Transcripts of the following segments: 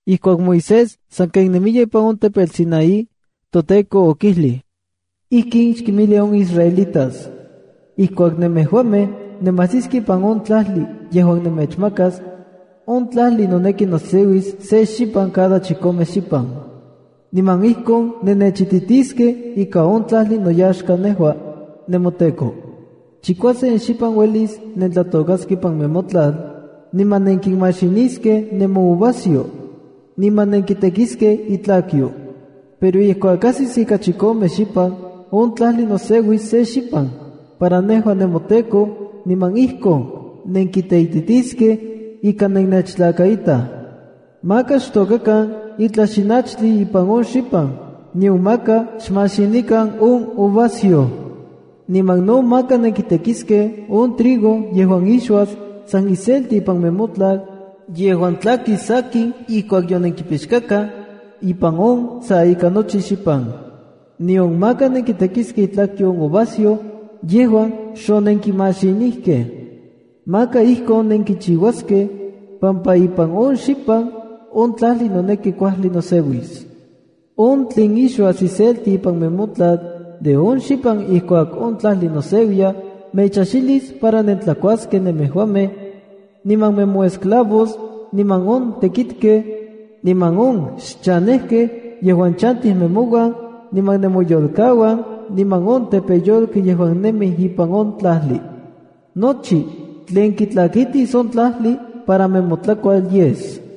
Ijkuak Moisés sanken nemiya ipan on tepetl Sinaí, toTEKO okijlij: “Ijkin xkinmijli on israelitas: Ijkuak nemejuamej nemajsiskej ipan on tlajli yejuan nemechmakas, on tlajli noneki noseuis se xipan cada chikome xipan. Niman ijkon nennechititiskej ika on tlajli noyaxka nejua, nemoTEKO. Chikuasen xipan uelis nentlatôkaskej ipan nemotlal, niman nenkinmaxiniskej nemouvasyoj, niman nenkitekiskej itlakyo. Pero ijkuak ajsis on ika chikome xipan, on tlajli noseuis se xipan para nejua nemoTEKO, niman ijkon nenkiteititiskej ika nennechtlakaitaj. Maka xtôkakan itlaj xinachtli ipan on xipan, nion maka xmaxinikan on uvasyoj. Niman no maka nenkitekiskej on trigo yejuan ixuas san iselti ipan nemotlal yejuan tlakis sakin, ijkuak yonenkipixkakaj ipan on sa ika nochi xipan. Nion maka nenkitekiskej itlakyo on uvasyoj yejuan xonenkimaxinijkej. Maka ijkon nenkichiuaskej pampa ipan on xipan, on tlajli noneki kuajli noseuis. On tlen ixuas iselti ipan nemotlal de on xipan ijkuak on tlajli noseuiya mechajxilis para nentlakuaskej nemejuamej, niman nemoesclavos, niman on tekitkej, niman on xchanejkej yejuan chantij nemouan, niman nemoyolkauan, niman on tepeyolkej yejuan nemij ipan on tlajli. Nochi tlen kitlakitis on tlajli para nemotlakual yes.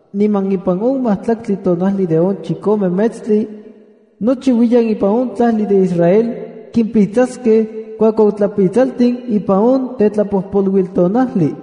niman ipan on majtlaktli tonajli de on chikome metstli, nochiuiyan ipan on tlajli de Israel kimpitsaskej kuakuautlapitsaltin ipan on Tetlapojpoluiltonajli.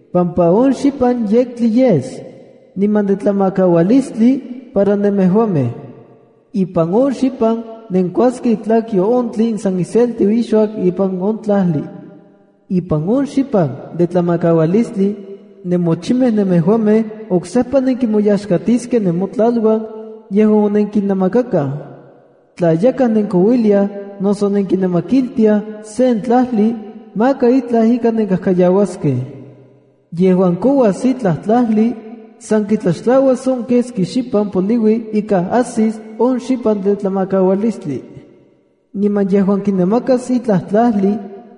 pampa on xipan yektli yes, niman de tlamakaualistli para nemejuamej. Ipan on xipan nenkuaskej itlakyo on tlen san iselti ixuas ipan on tlajli. ’Ipan on xipan de tlamakaualistli, nemochimej nemejuamej oksejpa nenkimoyaxkatiskej nemotlaluan yejuan onenkinamakakaj. Tla yakaj nenkouiliaj noso nenkinamakiltiaj sen tlajli, maka itlaj ika nenkajkayauaskej. Yejuan kouas itlaj tlajli, san kitlaxtlauas on keski xipan poliui ika ajsis on xipan de tlamakaualistli. Niman yejuan kinamakas ijtla tlajli,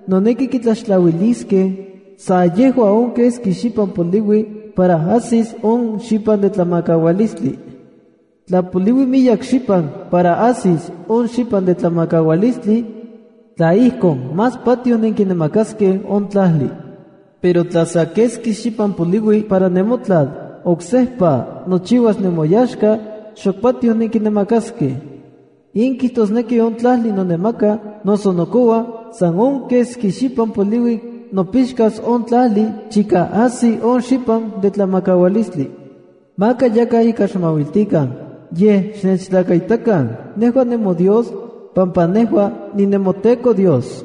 noneki kitlaxtlauiliskej sa yejua on keski xipan poliui para ajsis on xipan de tlamakaualistli. Tla poliui miyek xipan para ajsis on xipan de tlamakaualistli, tla ijkon, más patioj nenkinamakaskej on tlajli. Pero tla sa keski xipan poliui para nemotlal oksejpa nochiuas nemoyaxka, xok patioj nenkinamakaskej. In kijtosneki on tlajli nonamaka noso nokoua san on keski xipan poliui nopixkas on tlajli chika ajsi on xipan de tlamakaualistli. ’Maka yakaj ika xmauiltikan, yej xnechtlakaitakan nejua nemoDios, pampa nejua ninemoTEKO Dios.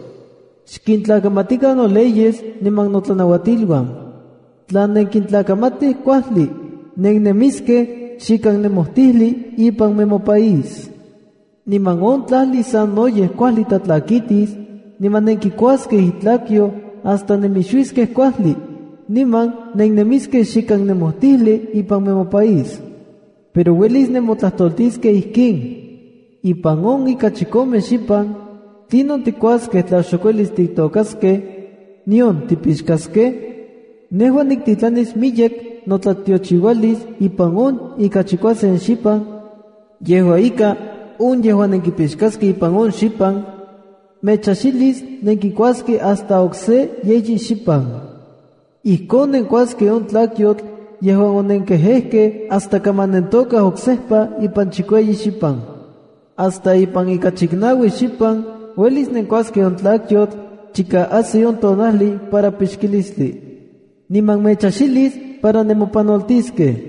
Xkintlakamatikan noleyes niman notlanauatiluan. Tla nenkintlakamatij kuajli, nennemiskej xikan nemojtijli ipan nemopaís, niman on tlajli sanoyej kuajli tlatlakitis, niman nenkikuaskej itlakyo hasta nemixuiskej kuajli, niman nennemiskej xikan nemojtijli ipan nemopaís. ’Pero uelis nemotlajtoltiskej ijkin: Ipan on ika chikomej xipan, ¿tlinon tikuaskej tla xok uelis titokaskej, nion tipixkaskej? Nejua niktitlanis miyek notlatiochiualis ipan on ika chikuasen xipan, yejua ika, on yejuan nenkipixkaskej ipan on xipan, mechajxilis nenkikuaskej hasta okse yeyi xipan. Ijkon nenkuaskej on tlakyotl yejuan onenkejejkej hasta kaman nentokaj oksejpa ipan chikueyi xipan. Hasta ipan ika chiknaui xipan uelis nenkuaskej on tlakyotl chika ajsi on tonajli para pixkilistli. Niman mechajxilis para nemopanoltiskej.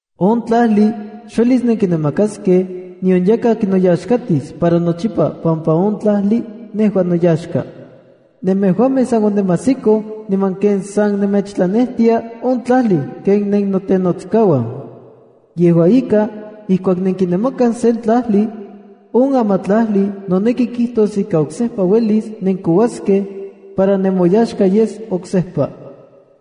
’On tlajli xuelis nenkinamakaskej nion yakaj kinoyaxkatis para nochipa pampa on tlajli nejua noyaxka. Nemejuamej san onemajsikoj niman ken san nemechtlanejtia on tlajli ken nennotenotskauan. Yejua ika, ijkuak nenkinamakaj sen tlajli, on amatlajli noneki kijtos ika oksejpa uelis nenkouaskej para nemoyaxka yes oksejpa.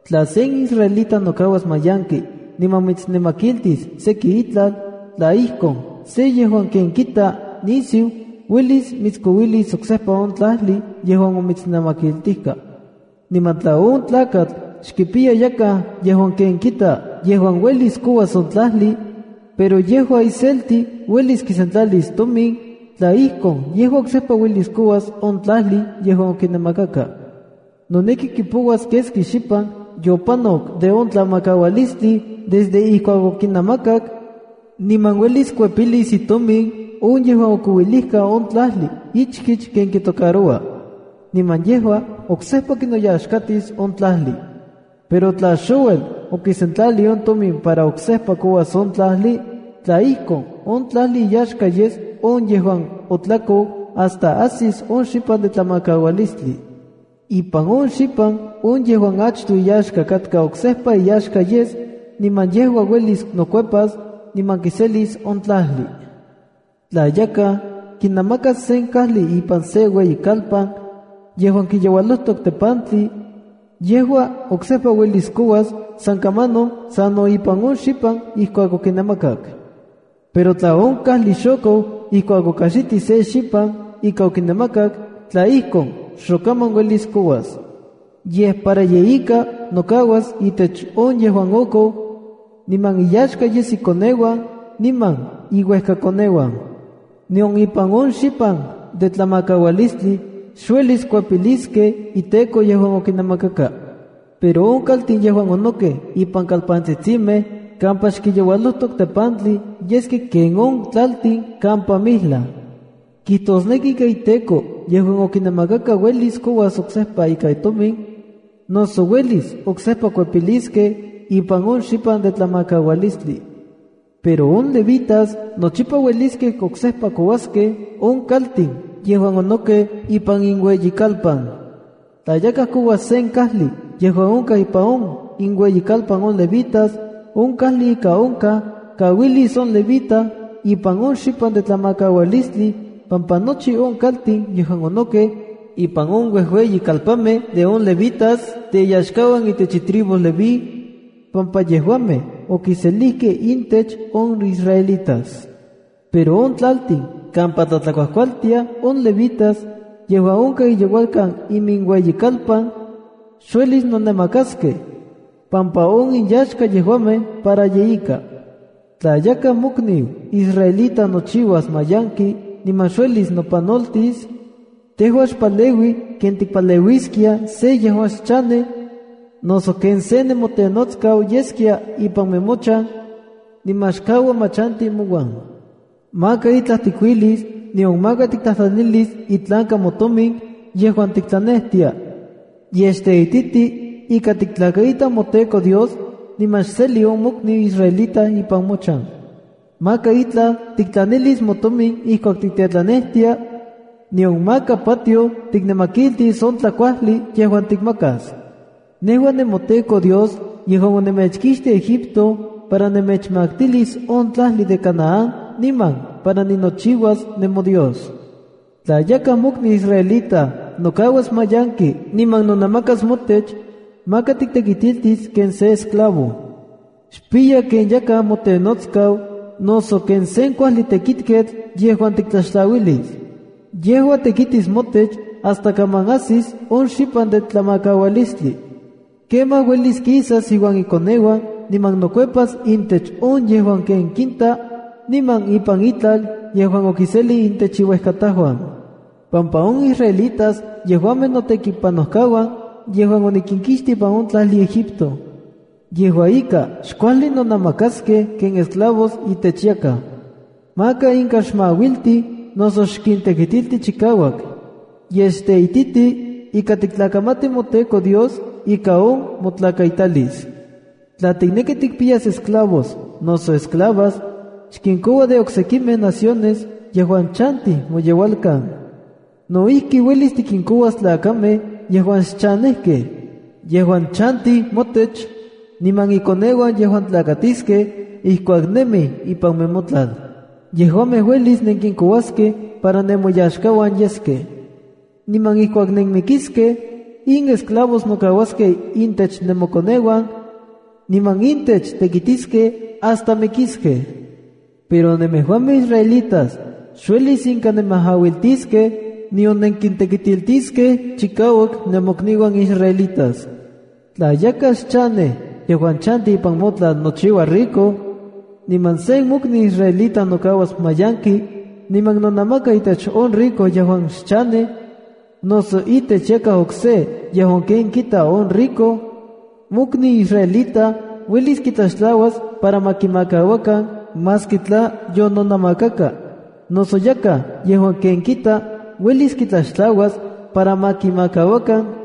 ’Tla sen israelita nokauas mayanki niman mitsnamakiltis seki itlal, tla ijkon, se yejuan ken kita nisiu uelis mitskouilis oksejpa on tlajli yejuan omitsnamakiltijkaj. ’Niman tla on tlakatl xkipiya yakaj yejuan ken kita yejuan uelis kouas on tlajli, pero yejua iselti uelis kisentlalis tomin, tla ijkon, yejua oksejpa uelis kouas on tlajli yejuan okinamakaka. Noneki kipouas keski xipan yopanok de on tlamakaualistli desde ijkuak okinamakak, niman uelis kuepilis itomin on yejuan okouilijka on tlajli ichkich ken kitocaroua, niman yejua oksejpa kinoyaxkatis on tlajli. Pero tla xouel okisentlalij on tomin para oksejpa kouas on tlajli, tla ijkon, on tlajli iyaxka yes on yejuan otlakou hasta ajsis on xipan de tlamakaualistli. Ipan on xipan on yejuan achtoj iyaxka katka oksejpa iyaxka yes niman yejua uelis nokuepas niman kiselis on tlajli. ’Tla yakaj kinamakas sen kajli ipan sen ueyikalpan yejuan kiyeualojtok tepantli, yejua oksejpa uelis kouas san kamanon sano ipan on xipan ijkuak okinamakak. Pero tla on kajli xokou ijkuak okajxitij se xipan ika okinamakak, tla ijkon, xokaman uelis kouas. Yej para yeika nokauas itech on yejuan okou, niman inyaxka yes ikoneuan niman iuejkakoneuan. Nion ipan on xipan de tlamakaualistli xuelis kuepiliskej iteko yejuan okinamakaka. Pero on kaltin yejuan onokej ipan kalpantsitsimej kampa xkinyeualojtok tepantli yeskej ken on tlaltin kampa mijlaj. Kijtosneki ika iteko yejuan okinamakaka uelis kouas oksejpa ikan tomin, noso uelis oksejpa kuepiliskej ipan on xipan de tlamakaualistli. ’Pero on levitas nochipa ueliskej oksejpa kouaskej on kaltin yejuan onokej ipan inueyikalpan. Tla yakaj koua sen kajli yejuan onkaj ipan inueyikalpan on levitas, on kajli ika onkaj kauilis on levita ipan on xipan de tlamakaualistli, pampa nochi on kaltin yejuan onokej ipan on uejueyikalpanmej de on levitas, teyaxkauan itech itribu levi, pampa yejuamej okiselijkej intech on israelitas. Pero on tlaltin kampa tlatlakuajkualtiaj on levitas yejuan onkaj iyeualkan iminueyikalpan, xuelis nonamakaskej, pampa on inyaxka yejuamej para yeika. ’Tla yakaj mokniu israelita nochiuas manyanki niman xuelis nopanoltis, tejua xpaleui ken tikipaleuiskia sen yejuan xchanej, noso ken se nemotenotskau yeskia ipan nemochan, niman xkaua ma chanti mouan. Maka itlaj tikuilis, nion maka tiktlajtlanilis itlanka motomin yejuan tiktlanejtia, yej xteititi ika tiktlakaita moTEKO Dios, niman xseli on mokniu israelita ipan mochan. Maka itlaj tiktlanilis motomin ijkuak tiktlanejtia, nion maka patioj tiknamakiltis on tlakuajli yejuan tikmakas. Nejua nemoTEKO Dios yejuan onemechkixtij Egipto para nemechmaktilis on tlajli de Canaán niman para ninochiuas nemoDios. ’Tla yakaj mokniu israelita nokauas mayanki niman nonamakas motech, maka tiktekitiltis ken sen esclavo. Xpiya ken yakaj motenotskau noso ken sen kuajli tekitketl yejuan tiktlaxtlauilis. Yejua tekitis motech hasta kaman ajsis on xipan de tlamakaualistli. Kemaj uelis kisas iuan ikoneuan niman nokuepas intech on yejuan ken kinta, niman ipan itlal yejuan okiselij itech iuejkatajuan, pampa on israelitas yejuamej notekipanojkauan yejuan onikinkixtij ipan on tlajli Egipto. Yejua ika, xkuajli nonamakaskej ken esclavos itech yakaj. Maka inka xmauilti noso xkintekitilti chikauak. Yej xteititi ika tiktlakamati moTEKO Dios ika on motlakaitalis. ’Tla tikneki tikimpiyas esclavos noso esclavas, xkinkoua de oksekimej naciones yejuan chantij moyeualkan. No ijki, uelis tikinkouas tlakamej yejuan xchanejkej, yejuan chantij motech, niman inkoneuan yejuan tlakatiskej ijkuak nemij ipan nemotlal. Yejuamej uelis nenkinkouaskej para nemoyaxkauan yeskej. Niman ijkuak nenmikiskej, in esclavos nokauaskej intech nemokoneuan, niman intech tekitiskej hasta mikiskej. Pero nemejuamej israelitas xuelis inka nemajauiltiskej nion nenkintekitiltiskej chikauak nemokniuan israelitas. ’Tla yakaj xchanej yejuan chanti ipan motlal nochiuas rico, niman sen mokniu israelita nokauas mayanki niman nonamaka itech on rico yejuan xchanej, noso itech yakaj okse yejuan ken kita on rico, mokniu israelita uelis kitlaxtlauas para ma kimakauakan maski tla yononamakaka. Noso yakaj yejuan ken kita kenon ikniu, uelis kitlaxtlauas para ma kimakauakan,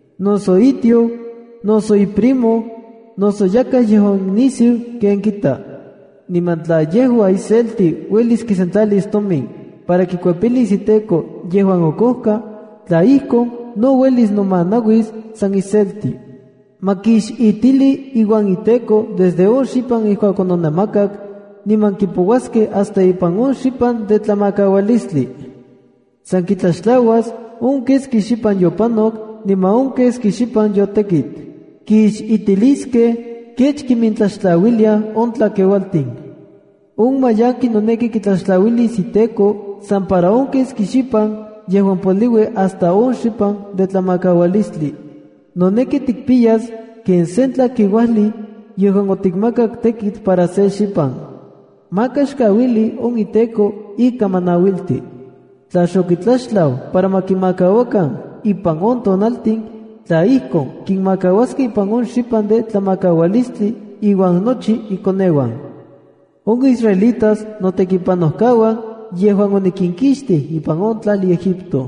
noso itioj, noso iprimo, noso yakaj yejuan nisiu ken kita. Niman tla yejua iselti uelis kisentlalis tomin para kikuepilis iteko yejuan okojka, tla ijkon, no uelis nomanauis san iselti. Ma kixitili iuan iteko desde on xipan ijkuak ononamakak niman kipouaskej hasta ipan on xipan de tlamakaualistli. San kitlaxtlauas de on keski xipan yopanok niman on keski xipan yotekit. Kixitiliskej kech kimintlaxtlauiliaj on tlakeualtin. On mayanki noneki kitlaxtlauilis iteko san para on keski xipan yejuan poliui hasta on xipan de tlamakaualistli. Noneki tikpiyas ken sen tlakeuajli yejuan otikmakak tekitl para se xipan. Maka xkauili on iteko ika ma nauilti. ’Tla xokitlaxtlau para ma kimakauakan ipan on tonaltin, tla ijkon, kinmakauaskej ipan on xipan de tlamakaualistli, iuan nochi ikoneuan. On israelitas notekipanojkauan yejuan onikinkixtij ipan on tlajli Egipto.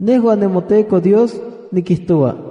Nejua nemoTEKO Dios nikijtoua.